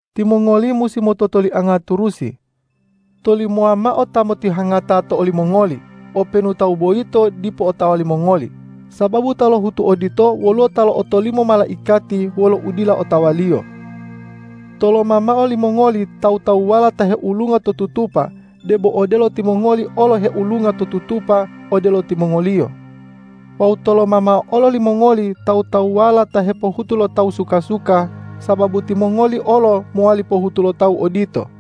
Timongoli musi mototolianga turusi. Tolimowa mao ta motihangata to olimongoli, openu tawu boyito dipo otawa limongoli, sababu ta lohutu odito woluwo ta lo'otolimo malaikati wolo udila otawaliyo. Toloma mao limongoli tawu-tawuwala ta heulunga to tutupa, debo odelo timongoli olo heulunga to tutupa odelo timongoliyo. Wawu toloma mao olo limongoli tawu-tawuwala ta hepohutu lo tawu suka-suka, sababu timongoli olo mowali pohutu lo tawu odito.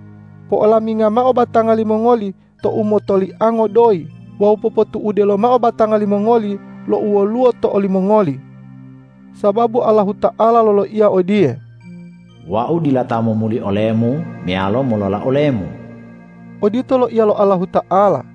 Po'olaminga mao batanga limongoli to umotoliango doyi wawu popotu'ude lomao batanga limongoli lo u woluwo to olimongoli. Sababu Allahuta'ala loloiya odiye,”Wau dila ta momuli olemu meyalo molola olemu.” Odito loiya lo Allahuta'ala.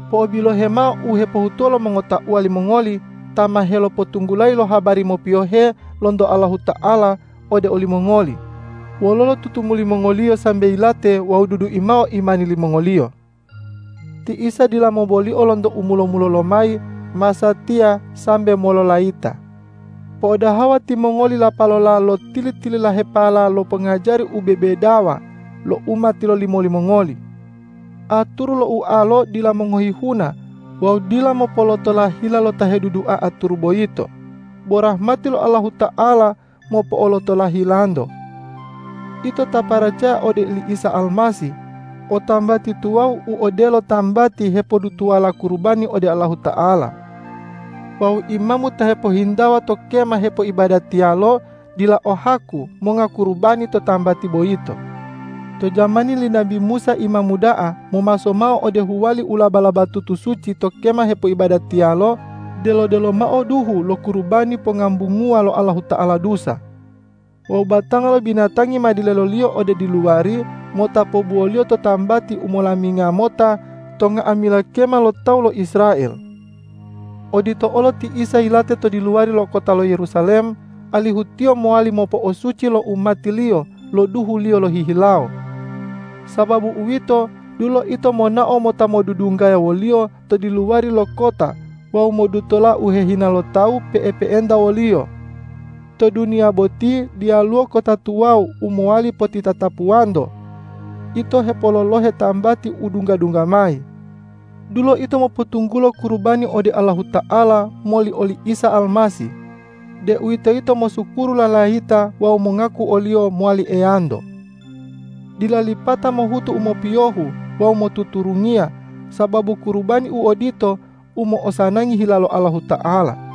Po'obilohe mao u hepohutuwo lo mongotauwa limongoli ta ma helopotunggulayi lo habari mopiyohe lonto Allahuta'ala ode olimongoli wololo tutumuli mongoliyo sambe yilate wawu dudui mao imani limongoliyo. Ti Isa dila mobolio lonto u mulo-mulolo lomayi, masatiya sambe mololayita. Po'odaha timongoli lapalola lo tili-tililahepala lo pongajari u bebedawa lo u ma tilolimo limongoli. Aturu lo ualo dila mongohi huna wawu dila mopolotola hila lo ta hedudua aturu boyito, bo rahmati lo Allahuta'ala mopo'olotola hilanto. Ito ta paracaya ode oli Isa Almasih, o tambati tuwawu u odelo tambati hepodutuwala kurubani ode Allahuta'ala. Wawu imamu ta hepohintawa to kema hepoibadatiyalo dila o haku monga kurubani to tambati boyito. To jamani li nabi Musa imamu da'a momaso mao ode huwali u laba-labatutu suci to kema hepoibadatiyalo delo-delo mao duhu lo kurubani pongambunguwa lo Allahuta'ala dusa. Wawu batanga lo binatangi ma deloliyo ode diluwari mota pobuwoliyo to tambati u molaminga mota to nga'amila kema lo tawu lo Israel. Odito olo ti Isa yilate to diluwari lo kota lo Yerusalem, alihu Tiyo mowali mopo'osuci lo umati-Liyo lo duhu-Liyo lohihilawo. Sababu uwito, dulo ito monao mota modudunggaya wo-Liyo to diluwari lo kota wawu modutola u hehina lo tawu pe'epe'enta wo-Liyo. To duniya boti diyaluwo kota tuwawu u mowali potitatapuwanto. Ito hepololohe tambati u dungga-dungga mayi. Dulo ito mopotunggulo kurubani ode Allahuta'ala moli oli Isa Almasih, deuwitoyito mosukuru lalayita wawu mongaku o-Liyo mowali Eyanto. Dila lipata mohutu u mopiyohu wawu motuturungiya, sababu kurubani u odito u mo'osanangi hila lo Allahuta'ala.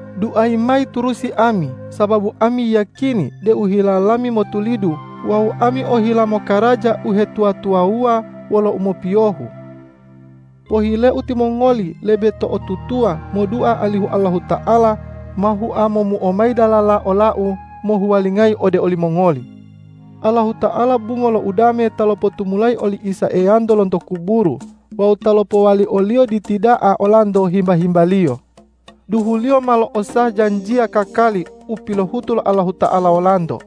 Duayi mayi turusi ami, sababu ami yiyakini deu hila lami motulidu wawu ami ohila mokaraja uhetuwa-tuwawuwa wolo umopiyohu. Pohileu timongoli lebe to'otutuwa modua alihu Allahuta'ala ma hua momuo mayi dalala olau mohuwalingayi ode olimongoli. Allahuta'ala bungo lo udame ta lopotumulayi oli Isa Eyanto lonto kuburu wawu ta lopowali o-Liyo Diti da'a olanto himba-himba-Liyo. Duhu-Liyo ma lo'osah janjiya kakali u pilohutu lo Allahuta'ala wolanto.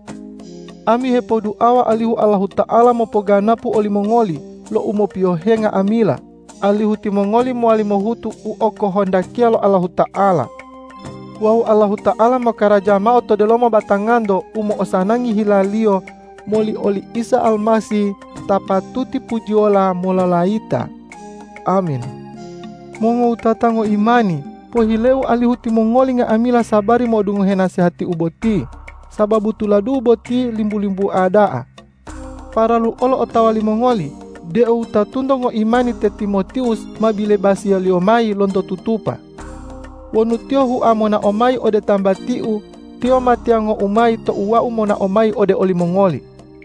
Ami hepoduawa alihu Allahuta'ala mopoganapu olimongoli lo u mopiyohe nga'amila, alihu timongoli mowali mohutu u okohondakiya lo Allahuta'ala. Wawu Allahuta'ala mokaraja mao to delomo batanganto u mo'osanangi hila-Liyo moli oli Isa Almasih ta patuti pujiyola mololayita! Amin. Mongowutata ngoimani, pohileu alihu timongoli nga'amila sabari modungohe nasehatiu boti, sababu tuladu'u boti limbu-limbua da'a. Paralu olo otawa limongoli deu wutatunto ngoimani te Timotiwus ma bilebasiyaliyo mayi lonto tutupa. Wonu tiyo hua monao mayi ode tambatiu, tiyo ma tiyangou mayi tou wau monao mayi ode olimongoli.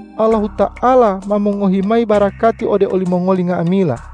Allahuta'ala ma mongohi mayi barakati ode olimongoli nga'amila.